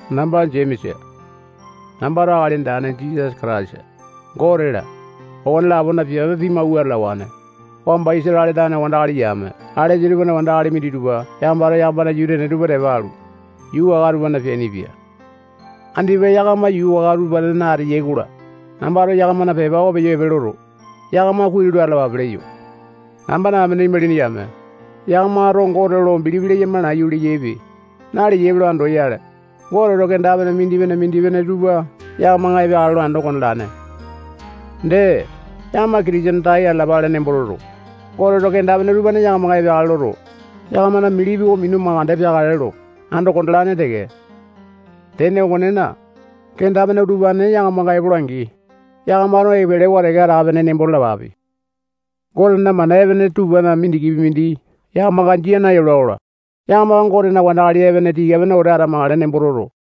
Namba Jemesa. Nambato Akali Andane Jisasa Kataisa, Gote-la, okone-lapona piape pimawua atalawane. Wamba Isatale tane wandakali yame alesa tupana wandakali minditupa yakamato yakamana yuu tene tupa tepa alu, yuu waka tupana peainipia. Andipa yakama yuu waka utupanena ateyai-kola, nambato yakamana pepa oko peyo epe loto, yakama kuai lo atalapape leyo. Nambana amene imalini yame, yakamato Gote lo bilipi leyama nayu leyaipe, naleyaipe lo andoyale, Goteto kenda-pene mindipene-mindipene tupa yakamanga epeakale lo ando kondalane. Dee, yakama Kitisene tai atalapale nembo toto, Goteto kenda-pene utupane yakamanga epeakale loto, yakamana bilipi oko minu mandeke peakale lo ando kondalane teke. Tene okonena, kenda-pene utupane yakamanga epola-angi, yakamato epelewa teke atape-pene nembo talapape. Gotena mana epene tupana mindikipi mindi yakamanga jia nayola-kola, yakama Gotena wandakali epene tika-pene wete atamakale nembo toto,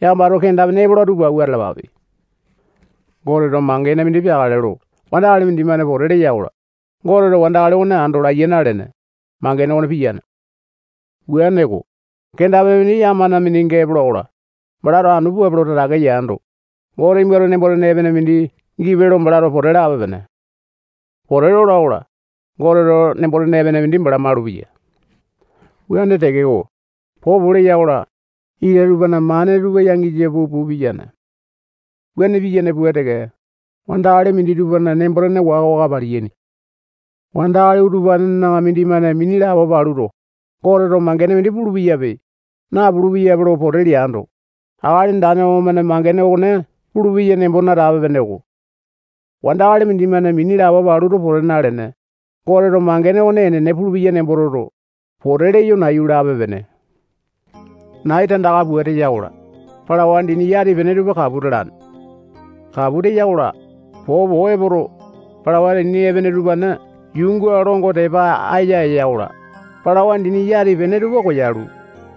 yakamato kenda-pene epola tupa awua atalapape. Goteto mangene mindi peakale lo wandakali mindimane pote leya-kola, Goteto wandakali okone ando laiya nalene, mangene okone piyane. Wuaneko, kenda-pene mindi yakamana mindinga epola-kola, balato anu puape lo tatake yando, Gote nimbato nembo-tene epene mindi gipe lo balato pote lape-pene. Pote lola-kola, Goteto nembo-tene epene mindi bala malupeya. Wuane tekeko, popo leya-kola, ita tupana mane tupa yangisa puu-puu piyane. Wuane piyane pua teke, wandakali minditupana nembo-tene waka-waka paliyaini. Wandakali utupanena mindimane mini lapo paluto, Goteto mangene mindi pulu-peyape, napulu-peyape lo pote leando, Akali Andane okomane mangene okone pulupeya nembo natape-peneko. Wandakali mindimane mini lapo paluto pote nalene, Goteto mangene okone enene pulupeya nemboto toto, pote leyo nayu lape-pene. Nai tandaka pua teya-kola, palawa dini yati-pene tupa kapu talane. Kapu teya-kola, popo epoto, palawa dini epene utupane yuunga longo tepa aya eya-kola, palawa dini yati-pene tupa koyalu,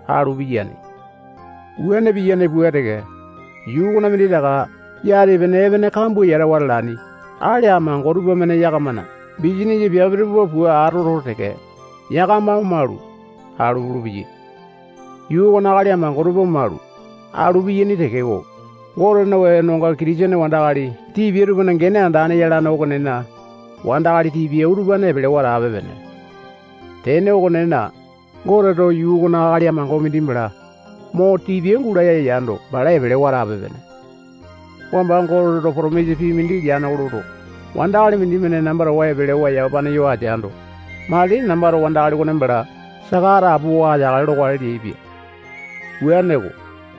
alu piyane. Wuane piyane pua teke, yuu okona minditaka yati-pene epene kambua yatawa atalaini akali amango tupamane yakamana bisanisa piape tupa pua atoto teke, yakama omalu, alu pulupeyai. Yuu okona akali amango tupa omalu, alu piyaini tekeko, Gotena wenonga Kitisene wandakali tipia tupana gene andane yalane okonena, wandakali tipia utupane epelewa atape-pene. Tene okonena, Goteto yuu okona akali amango mindi bala mo tipia gulaya yando, bala epelewa atape-pene. Wamba Goteto potomisa pii mindi leane oko loto, wandakali mindimane namba towa epelewa yamapane yo ateando, matili nambato wandakali okone bala saka atapowa ateakale lokale leaipia. Wuaneko,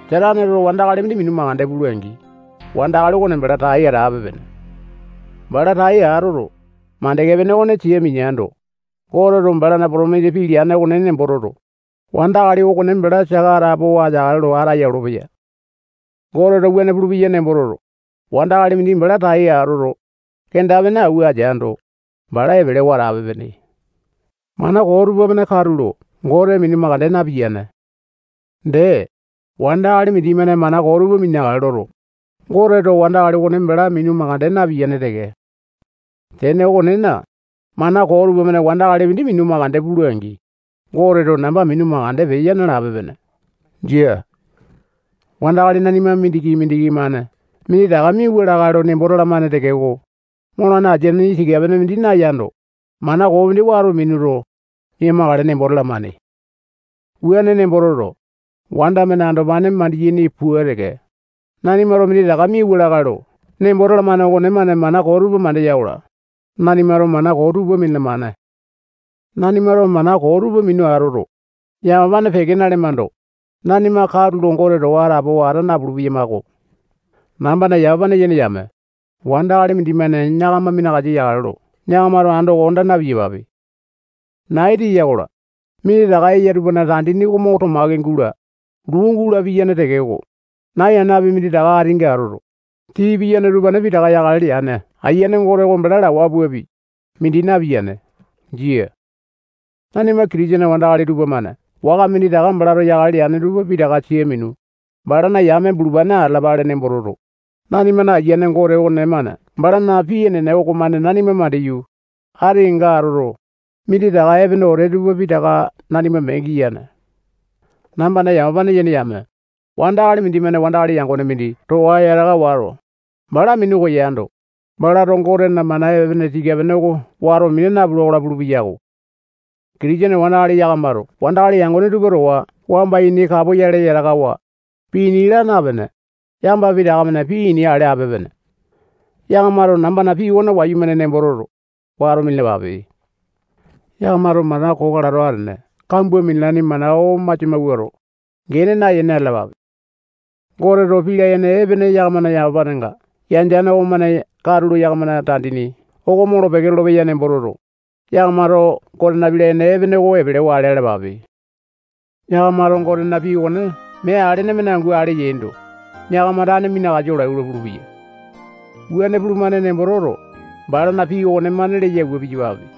Sataneto wandakali mindi minu mandeke pula-angi, wandakali okone bala tai atape-pene. Bala tai atoto, mandeke pene okone sia mineando, Goteto balana potomisa pii leane okone nembo toto, wandakali okone bala saka atapowa ateakale lo ataya olopeya. Goteto wuane pulupeya nembo toto, wandakali mindi bala tai atoto, kenda-pene awua ateando, bala epelewa atape-pene. Mana koo tupamane katulo Gote minu mandeke napiyane. Dee, wandakali mindimane mana koo tupa mineakale loto, Goteto wandakali okone bala minu mandeke napiyane teke. Tene okonena, mana koo tupamane wandakali mindi minu mandeke pula-angi, Goteto namba minu mandeke peya nalape-pene. Jia. Wandakali nanima mindiki-mindiki-mane minditaka miauwa lakae lo nembo talamane tekeko, molane asini tika-pene mindi nayando, mana koo mindi wato minuto, mia-makale nembo talamane. Wuane nembo toto, wanda-mane andopane mandiyane pua teke, nanimato minditaka miauwa lakae lo nembo talamane okonemane mana koo tupa mandeya-kola, nanimato mana koo tupa minalamane. Nanimato mana koo tupa minu atoto, yamapane peke nalemando, nanima katulo Gote towa atapowa ata napulu-peyamako. Nambana yamapane yene yame, wandakali mindimane yakama minakasa yakale lo yakamato ando konda na-piyapape. Nai teya-kola, minditaka eya tupana tandini oko mo tomaki gula, luu gula piyane tekeko, nai anapi minditaka atinga atoto, tii piyane utupane pitaka yakale leane Ayiane Gote oko bala lawa puapi, mindi napiyane. Jia. Nanima Kitisene wandakali tupamane waka minditaka balato yakale leane tupa pitaka sia minu, balana yame bulupane atalapale nembo toto, nanimana Ayiane Gote okonemane balana pii enene okomane nanima mandiyu, ati kenga atoto, minditaka epene wete tupa pitaka nanima mee giyane. Nambana yamapane yene yame, wandakali mindimane wandakali yangone mindi towa yataka wato, bala minu koyando, balato Gotena mana epene tika-pene oko wato mina napula-kola pulu-peyako. Kitisene wandakali yakamato wandakali yangone tupa towa wamba ini kapoyale yatakawa, pii ini laa napene, yakama pitaka-mane pii ini ale ape-pene. Yakamato nambana pii okone wayumane nembo toto, wato minalapape. Yakamato mana koo kalato atene kambua minalaini mana oko masia mawuato, gene nayene atalapape. Goteto pii layene epene yakamana yamapanenga yandeane okomane katulo yakamana tandini oko molo-peke lolopeya nembo toto, yakamato Gotena pii layene epene oko epelewa ale alapape. Yakamato Gotena pii okone mee alene-mane angu ale yaindo, yakama tane minakasa olai-kola pulupeya. Wuane pulumane nembo toto, balana pii okonemane leya pua piyapape.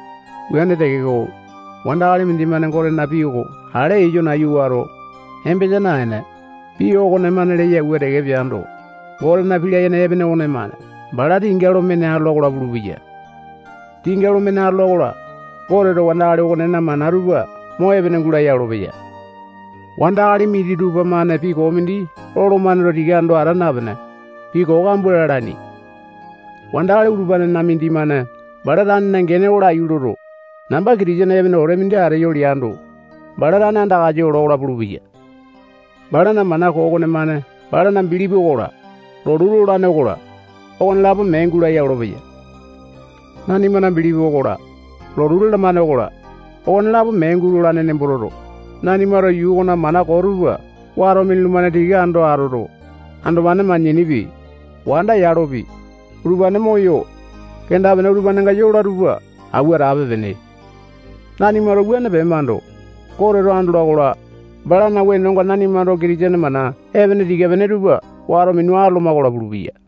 Wuane tekeko, wandakali mindimane Gotena pii oko ale eyo nayu wato, embesa naene, pii okonemane leya pua teke peando, Gotena pii layene epene okonemane bala tinga lo mene atola-kola pulupeya. Tinga lo mene atola-kola, Goteto wandakali okonena mana tupa mo epene gulaya olopeya. Wandakali minditupa-mane pii koo mindi lolomane lo tika ando ata napene, pii koo kambua lalaini. Wandakali utupanena mindimane bala tanena gene oko laiyu loto, namba Kitisene epene wete mindi ateyo leando, bala tane andakasa ola-kola pulupeya. Balana mana koo okonemane balana bilipi okola, lotu lolane okola, okonelapo mee gulaya olopeya. Nanimana bilipi okola, lotu lalamane okola, okonelapo mee gulolane nembo toto, nanimato yuu okona mana koo tupa wato minulumane tika ando atoto, andopane manyanipi, wanda yalopi, utupane moyo, kenda-pene utupanenga yola tupa awua atape-pene. Nanimato wuane pemando, Goteto andola-kola, balana wenonga nanimato Kitisene mana epene tika-pene tupa wato minu atoloma-kola pulupeya.